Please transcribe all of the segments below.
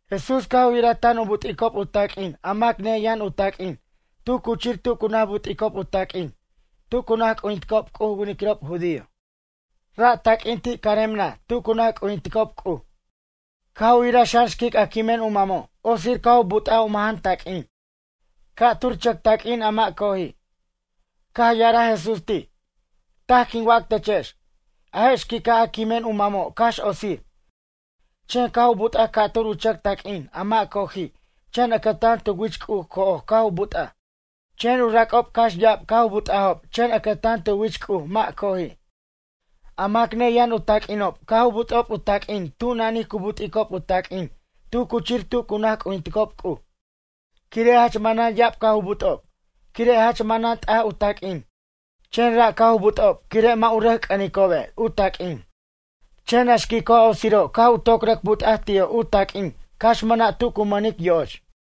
Jesús caj u yiraj tan u but'icob u taq'uin a mac neyʌn u taq'uin tu cuchir tu cu naj but'icob u taq'uin tu cu naj c'ujinticob C'uj u winiquirob judío. Ra' taq'uin ti' carem naj tu cu naj c'ujinticob C'uj. Caj u yiraj xan xquic a quimen u mamo' otsir caj u but'aj u majan taq'uin, ca'tur chʌc taq'uin a mʌ' coji'. Caj ya'araj Jesús ti': ―Taj quin wac techex. A je' xquica' a quimen u mamo' cax otsir. Chen caj u but'aj ca'tur u chʌc taq'uin a mʌ' coji' chen ʌcʌtan tu wich C'uj co'oj caj u but'aj. Chen u rac'ob cax ya'ab caj u but'ajob chen ʌcʌtan tu wich C'uj mʌ' co'oji'. A mac neyʌn u taq'uinob caj u but'ob u taq'uin tu nanij cu but'icob u taq'uin tu cuchir tu cu naj c'ujinticob C'uj. Quire' jach manan ya'ab caj u but'ob quire' jach manan t'aj u taq'uin chen ra' caj u but'ob quire' mʌ' u rʌc c'ʌnicobe' u taq'uin. Chen a xquico' a otsiro' caj u toc rʌc but'aj ti'o' u taq'uin cax mʌna' tu cu mʌnic yo'och.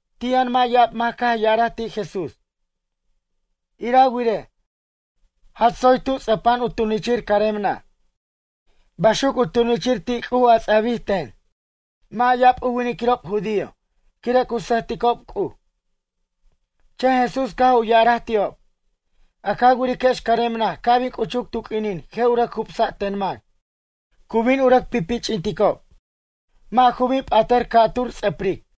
Ti' yʌn mʌ' ya'ab mac caj ya'araj ti' Jesús: ―Ira wirej, jach tsoy tu ts'ʌpa'an u tunichir carem naj. Baxuc u tunichir ti' C'uj a ts'abij ten, mʌ' ya'ab u winiquirob judío, quire' cu sʌjticob C'uj. Chen Jesús caj u ya'araj ti'ob: ―A ca wiriquex carem naj ca' bin c'uchuc tu q'uinin je' u rʌc jubsa' ten mac. Cu bin u rʌc pipich'inticob, mʌ' ju bin p'atʌr ca'tur ts'ʌpric.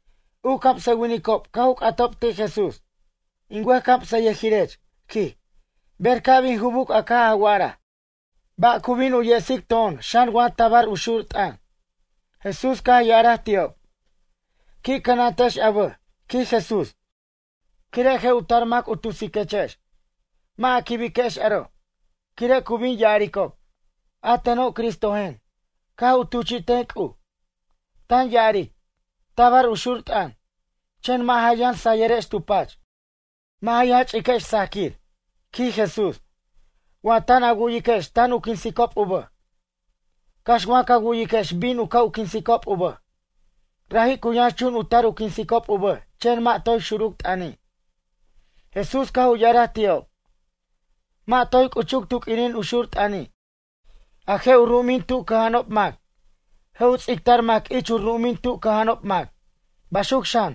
U camsʌwinicob caj u c'atob ti' Jesús: ―In wʌjcamsʌyʌjirech ―quij―, ber ca' bin jubuc a caj a wa'araj? Ba' cu bin u yesic to'on xan wa tabar u xur t'ʌn? Jesús caj ya'araj ti'ob: ―Qui' cʌnantex a bʌj ―quij Jesús―, quire' je' u tar mac u tusiquechex. Mʌ' a quibiquex aro'. Quire' cu bin ya'aricob: “A teno' Cristojen, caj u tuchi'ten C'uj.” Tan ya'aric: “Tabar u xur t'ʌn.” Chen mʌ' ja yʌn sayʌrex tu pach. Mʌ' ja ch'iquex sajquir ―quij Jesús―, wa tan a wu'yiquex tan u quinsicob u bʌj. Cax wa cu wu'yiquex bin u ca' quinsicob u bʌj. Raji' cu yʌnxchun u tar u quinsicob u bʌj chen mʌ' toy xuruc t'ʌni'. Jesús caj u ya'araj ti'ob: ―Mʌ' toy c'uchuc tu q'uinin u xur t'ʌni' A je' u ru'umin tu cʌja'anob mac. Je' u ts'ictar mac ich u ru'umin tu cʌja'anob mac. Baxuc xan,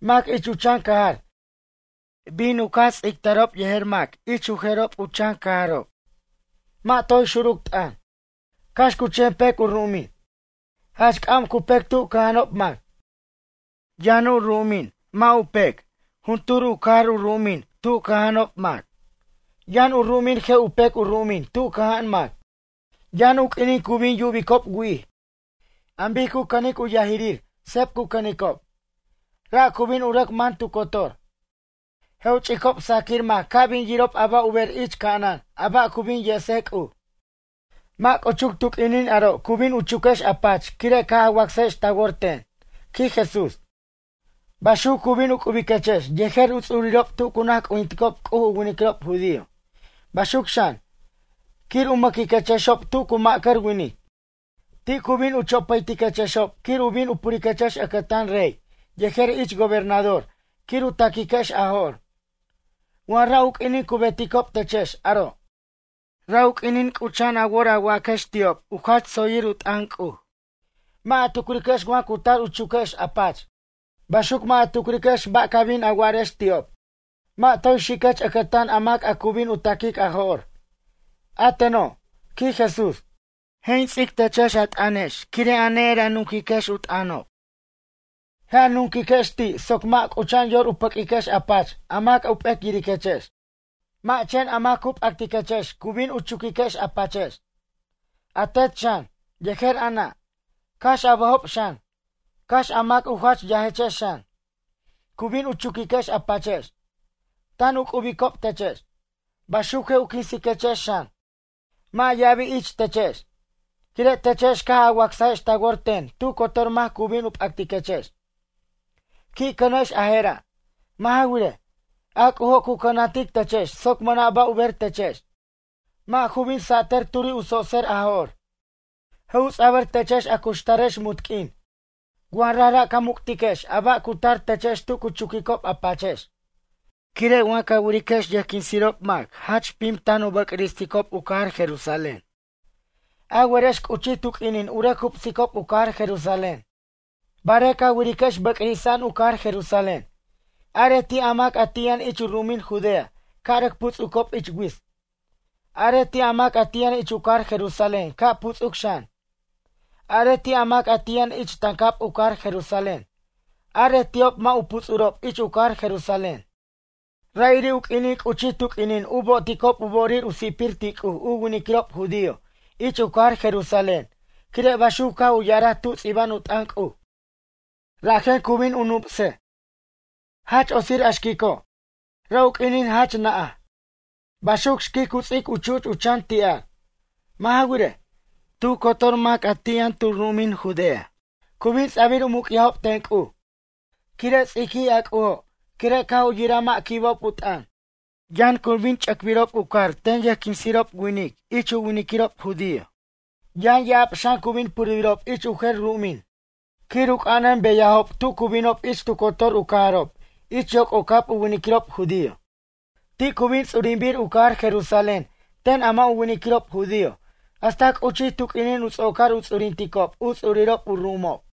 mac ich u chan cajar. Bin u caj ts'ictarob yejer mac ich u jerob u chan cajarob. Mʌ' toy xuruc t'ʌn, cax cu chen pec u ru'umin. Jach c'am cu pec tu cʌja'anob mac. Yʌn a ru'umin mʌ' u pec juntur u cajar u ru'umin tu cʌja'anob mac. Yʌn u ru'umin je' u pec u ru'umin tu cʌja'an mac. Yʌn u q'uinin cu bin yubicob wi'ij. An bic cu cʌnic u yajirir seb cu cʌnicob. Ra' cu bin u rʌc man tu cotor. Je' u ch'icob sajquir mac ca' bin yirob a ba' u ber ich ca'anan a ba' cu bin yesej C'uj. ’Mʌ' c'uchuc tu q'uinin aro' cu bin chuquex a pach quire' caj a wacsajex ta wor ten ―quij Jesús―. Baxuc cu bin u c'ubiquechex yejer u ts'urirob tu cu naj c'ujinticob C'uj u winiquirob judío. Baxuc xan, quir u mʌquiquexob tu cu ma'cʌr winic. Ti' cu bin u chopʌytiquexob quir u bin u puriquechex ʌcʌtan rey yejer ich gobernador quir u taquiquex a jo'r. Wa ra' u q'uinin cu beticob techex aro', ra' u q'uinin c'ucha'an a wor a waquex ti'ob u jach tsoyir u t'ʌn C'uj. Mʌ' a tucriquex wa cu tar u chuquex a pach. Baxuc mʌ' a tucriquex ba' ca bin a wa'arex ti'ob. Mʌ' toy xiquex ʌcʌtan a mac a cu bin u ta'quic a jo'r. A teno' ―quij Jesús―, je' in ts'ic techex a t'ʌnex quire' a ne'er a nuquiquex u t'ʌnob. Je' a nunquiquex ti' soc mʌ' c'ucha'an yor u pʌq'uiquex a pach a mac u p'ec yiriquechex. Mʌ' chen a mac cu p'actiquechex cu bin u chuquiquex a pachex. A tet xan, yejer a nʌ', cax a bʌjob xan, cax a mac a u jach yajechex xan, cu bin u chuquiquex a pachex, tan u c'ubicob techex. Baxuc je' u quinsiquechex xan, mʌ' ya'abi' ich techex. Quire' techex caj a wacsajex ta wor ten tu cotor mac cu bin u p'actiquechex. Qui' cʌnex a je'ra'. Mʌ' ja wirej, a C'ujo' cu cʌnantic techex soc mʌna' ba' u ber techex, mʌ' ja bin satʌr turi' u tsotser a jo'r. Je' u ts'abʌr techex a cuxtarex munt q'uin wa rajra' ca muc'tiquex a ba' cu tar techex tu cu chuquicob a pachex. ’Quire' wa ca wiriquex yʌjquinsirob mac jach pim tan u bʌcristicob u cajar Jerusalén. A werex c'uchij tu q'uinin u rʌc jubsicob u cajar Jerusalén. Barej ca wiriquex bʌcrisa'an u cajar Jerusalén. Arej ti' a mac ti' yʌn ich u ru'umin Judea ca' rʌc puts'ucob ich wits. Arej ti' a mac ti' yʌn ich u cajar Jerusalén ca' putsuc xan. Arej ti' a mac ti' yʌn ich tancab u cajar Jerusalén. Arej ti'ob mʌ' u puts'urob ich u cajar Jerusalén. Ra'iri' u q'uinin c'uchij tu q'uinin u bo'oticob u bo'orir u si'pir ti' C'uj u winiquirob judío ich u cajar Jerusalén quire' baxuc caj u ya'araj tu ts'iba'an u t'ʌn C'uj. Rajen cu bin u nupsej. Jach otsir a xquico', ra' u q'uinin jach na'aj. Baxuc xquic cu ts'ic u chu'ch u chan ti'ar. Mʌ' ja wirej, tu cotor mac a ti' yʌn tu ru'umin Judea, cu bin ts'abir u muc'yajob ten C'uj. Quire' ts'iquij a C'ujo' quire' caj u yiraj mʌ' quibob u t'ʌn. Yʌn cu bin ch'ʌcbirob u car ten yʌjquinsirob winiquirob ich u winiquirob judío. Yʌn ya'ab xan cu bin purbirob ich u jer ru'umin quir u c'anʌn beyajob tu cu binob ich tu cotor u cajarob ich yoc'ocab u winiquirob judío. Ti' cu bin ts'urinbir u cajar Jerusalén ten a mʌ' u winiquirob judío hasta c'uchij tu q'uinin u ts'ocar u ts'urinticob u ts'urirob u ru'umob.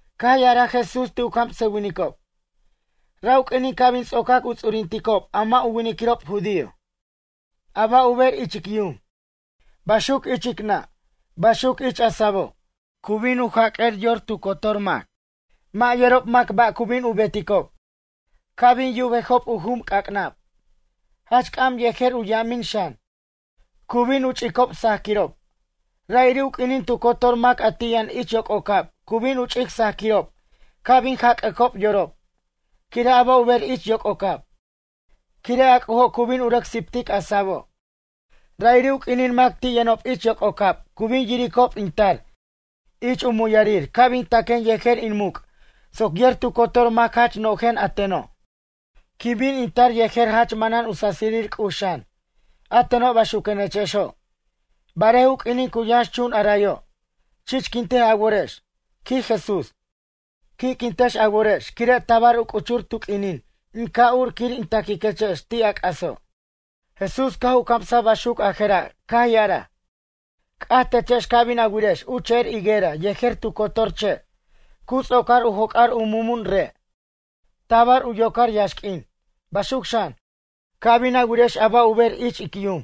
Caj ya'araj Jesús ti' u camsʌwinicob: ―Ra' u q'uinin ca' bin ts'ocac u ts'urinticob a mʌ' u winiquirob judío. A ba' u ber ich ic yum, baxuc ich ic nʌ'. Baxuc ich a sabo', cu bin u jac'ʌr yor tu cotor mac. Mʌ' yerob mac ba' cu bin u beticob. Ca' bin yubejob u jum c'ac'nab, jach c'am yejer u yamin xan. Cu bin u ch'icob sajquirob. Ra'iri' u q'uinin tu cotor mac a ti' yʌn ich yoc'ocab cu bin u ch'ic sajquirob ca' bin jac'ʌcob yorob. Quire' a ba' u ber ich yoc'ocab. Quire' a C'ujo' cu bin u rʌc siptic a sabo'. Ra'iri' u q'uinin mac ti' yʌnob ich yoc'ocab cu bin yiricob in tar ich u muyarir ca' bin taquen yejer in muc' soc yer tu cotor mac jach no'jen a teno'. Quin bin in tar yejer jach manan u sasirir C'uj xan. A teno' baxuquenechexo'. Barej u q'uinin cu yʌnxchun arayo' chichquintej a worex ―quij Jesús―, qui'quintex a worex quire' tabar u c'uchur tu q'uinin in ca' ur quir in ta'quiquechex ti' a c'aso'. Jesús caj u camsaj baxuc a je'ra' caj ya'araj: ―C'aj techex ca' bin a wirex u che'er higuera yejer tu cotor che'. Cu ts'ocar u joc'ar u mumun re', tabar u yocar yaxq'uin. Baxuc xan, ca' bin a wirex a ba' u ber ich ic yum.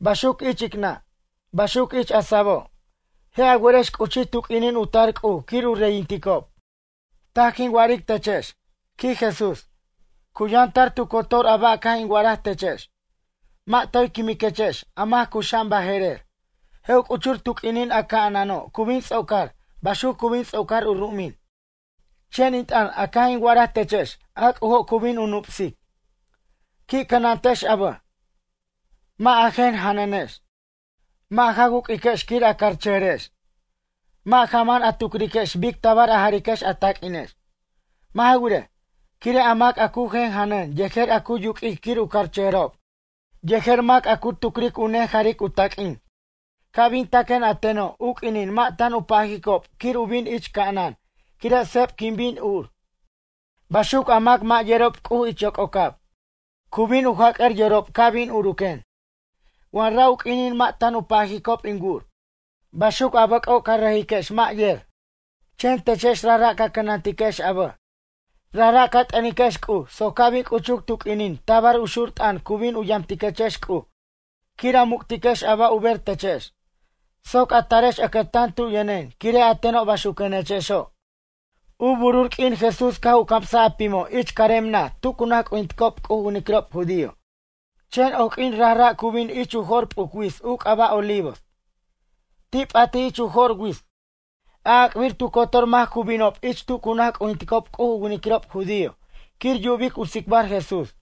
Baxuc ich ic nʌ'. Baxuc ich a sabo', je' a werex c'uchij tu q'uinin u tar C'uj quir u reyinticob. ’Taj quin wa'aric techex ―quij Jesús―, cu yʌn tar tu cotor ba' a caj in wa'araj techex. Mʌ' toy quimiquechex a mac cuxa'an baje'rer. Je' u c'uchur tu q'uinin a ca'anano' cu bin ts'ocar baxuc cu bin ts'ocar u ru'umin. Chen in t'ʌn a caj in wa'araj techex a C'ujo' cu bin u nupsic. ’Qui' cʌnantex a bʌj. Mʌ' a jen janʌnex, mʌ' ja wuq'uiquex quir a carchʌjʌrex. Mʌ' ja man a tucriquex bic tabar a jariquex a taq'uinex. Mʌ' ja wirej, quire' a mac a cu jen janʌn yejer a cu yuq'uic quir u carchʌjʌrob yejer mac a cu tucric u nejaric u taq'uin ca' bin taquen a teno' u q'uinin mʌ' tan u pajicob quir u bin ich ca'anan quire' seb quin bin ur. Baxuc a mac mʌ' yerob C'uj ich yoc'ocab cu bin u jac'ʌr yorob ca' bin uruquen wa ra' u q'uinin mʌ' tan u pajicob in wur. Baxuc a bʌc'o' ca rejiquex mʌ' yer. Chen techex rajra' ca cʌnantiquex a bʌj. Rajra' ca t'ʌniquex C'uj soc ca' bin c'uchuc tu q'uinin tabar u xur t'ʌn cu bin u yamtiquechex C'uj quir a muc'tiquex a ba' u ber techex. Soc a tarex ʌcʌtan tu yʌnen quire' a teno' baxuquenechexo'. U burur q'uin Jesús caj u camsaj a pimo' ich carem naj tu cu naj c'ujinticob C'uj u winiquirob judío. Chen oq'uin rara' cu bin ich u jo'r p'uc wits u c'aba' Olivos. Ti' p'atij ich u jo'r wits. A'ac'bir tu cotor mac cu binob ich tu cu naj c'ujinticob C'uj u winiquirob judío quir yubic u tsicbar Jesús.